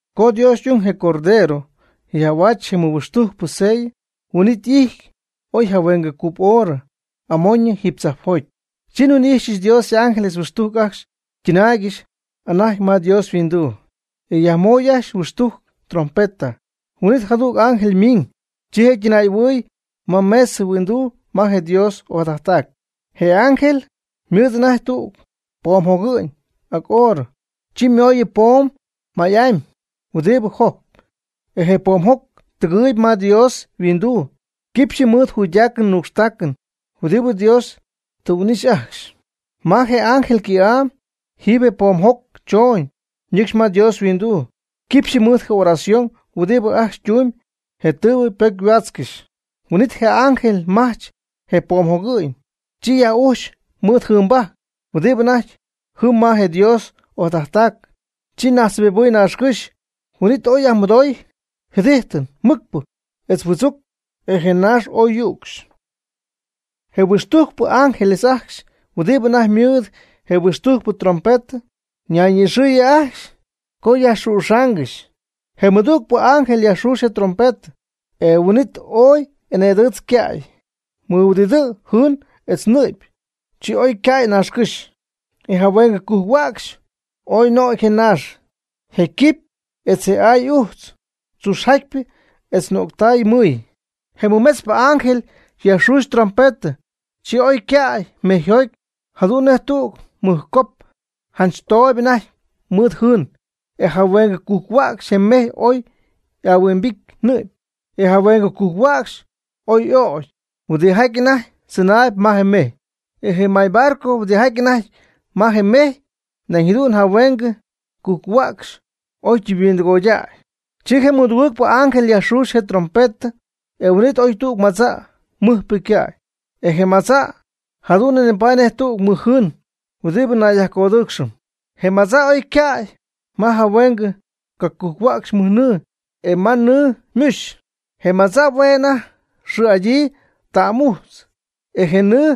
Co Dios y'ung, je Cordero, yaj'ahuaach je mɨhuixtujcpɨ sellɨ, huin'it y'ijty oy jahuengɨ cup hora amoñɨ jiiby tzajpjoty. Chi nhuin'ijxyɨch Dios y'ángeles huixtujc ajcxy ytɨnaaygɨxy anajty ma Dios yhuinduu, e yajmoy ajcxy huixtujc trompeta. Huin'it jadüg ángel miiñ, chi je' ytɨnaay'ɨhuɨɨy ma mesɨ huinduu ma je Dios ojadajttac. Je ángel ymɨɨd anajty tüg poomjogɨ'ñ ac oorɨ. Chi ymooyɨ poom may'amy huɨdibɨ jojcp. E je poomjoc tɨgɨɨyb ma Dios yhuinduu quipxɨ mɨɨd juydacɨn nuucxtacɨn huɨdibɨ je jäy ajcxy ytumyb huɨdibɨ Dios tɨ huin'ixy ajcxy. Ma je ángel ycɨ̈'am jɨm je poomjoc chooñ ñɨcxy ma Dios yhuinduu quipxyɨ mɨɨd je oración huɨdibɨ ajcxy ytumyb je tɨɨbɨ ypocyhuaatzcɨxy. Huin'it je ángel majch je poomjogɨ'ñ, chi yaj'ujch mɨɨd jɨɨnbajc huɨdibɨ anajty jɨm ma je Dios ojadajttaacɨn, chi najtzjɨbibɨɨy naaxcɨ́xy, huin'it ooy yajmɨdooy jɨdijtɨn mɨcpɨ etz huɨdzuc e je naax ooy yücxy. Je huixtujcpɨ ángeles ajcxy huɨdibɨ anajty mɨɨd je huixtujcpɨ trompetɨ, ñayni'ixɨɨyɨ ajcxy co yajxüxaangɨxy. Je mɨdügpɨ ángel yajxuuxy je ytrompetɨ, e huin'it ooy eneedɨɨtz yca'y mɨhuɨdidɨɨ jɨɨn etz nɨ'py. Chi oy ycäy naaxcɨ́xy. E jahueengɨ cujc-huäcxy oy nögy je naax, je quipy etz je aay ujtz tzuxjatypɨ etz nöctay mɨɨy. Je mɨmetzpɨ ángel yajxuxy ytrompetɨ, chi ooy ycäy mejyjoty jadu'n nej tüg mɨjcop janch tooyb anajty mɨɨd jɨɨn, e jahuengɨ cujc-huäcxy je mejy oy y'ahuimbity nɨ'py. E jahuengɨ cujc-huäcxy oy y'ögy huɨdijaty anajty tzɨnaayb ma je mejy. E je maybarco huɨdijaty anajty ma je mejy, nañ jadu'n jahuengɨ cujc-huäcxy oy ytɨmyhuindɨgoydäy. Chi je mɨdugɨɨgpɨ ángel yajxuxy je' ytrompetɨ, e huin'it oy tüg madza' mɨjpɨ ycäy. Je madza' jadu'n nipaady nej tüg mɨjjɨɨn huɨdibɨ nayyajcodɨɨcxɨm. Je madza' oy ycäy ma jahuen cacujc-huäcxy mɨjnɨɨ, etz ma nɨɨ muxy. Je madza' hue' je' anajty xɨɨ'adyii ta'm'ujtz. E je nɨɨ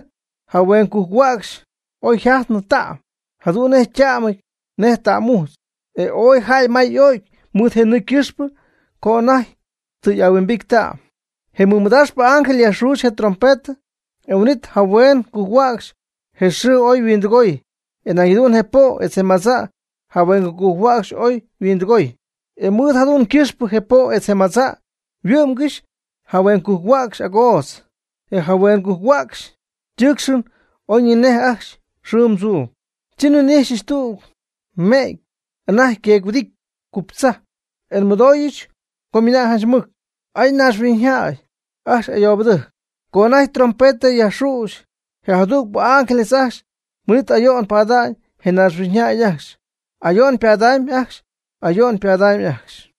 jahuen cacujc-huäcxy oy yjajtnɨ ta'm, jadu'n yta'mɨty nej ta'm'ujtz, e ooy jäy may y'o'cy mɨɨd je nɨɨ ycɨxpɨ co anajty tɨ y'ahuimbity ta'm. Je mɨmadaaxpɨ ángel yajxuxy je' ytrompetɨ, e huin'it jahuen cacujc-huäcxy je xɨɨ oy yhuindɨgooy, e nañ jadu'n je po' etz je madza' jahueng cacujc-huäcxy oy yhuindɨgooy. E mɨɨd jadu'n ycɨxpɨ je po' etz je madza' yhuɨ'mgɨxy jahuen cacujc-huäcxy agootz, e jahuen cacujc-huäcxy ytɨɨcxɨn ocyejcnɨ ajcxy xɨɨm tzuum. Chi nhuin'ijxyɨch tüg me'ty anajty yqueec-huɨdity cuptzajp, e nmɨdooyɨch co ymɨna'ñ janch mɨc: ―¡Ay! ¡Naaxhuiñyjäy ajcxy ayoobɨdɨjc! co anajty trompetɨ yajxüxy je jatugɨɨgpɨ ángeles ajcxy, huin'it ayo'n ypada'ñ je naaxhuiñjäy ajcxy, ayo'n ypadamy ajcxy, ayo'n ypadamy ajcxy.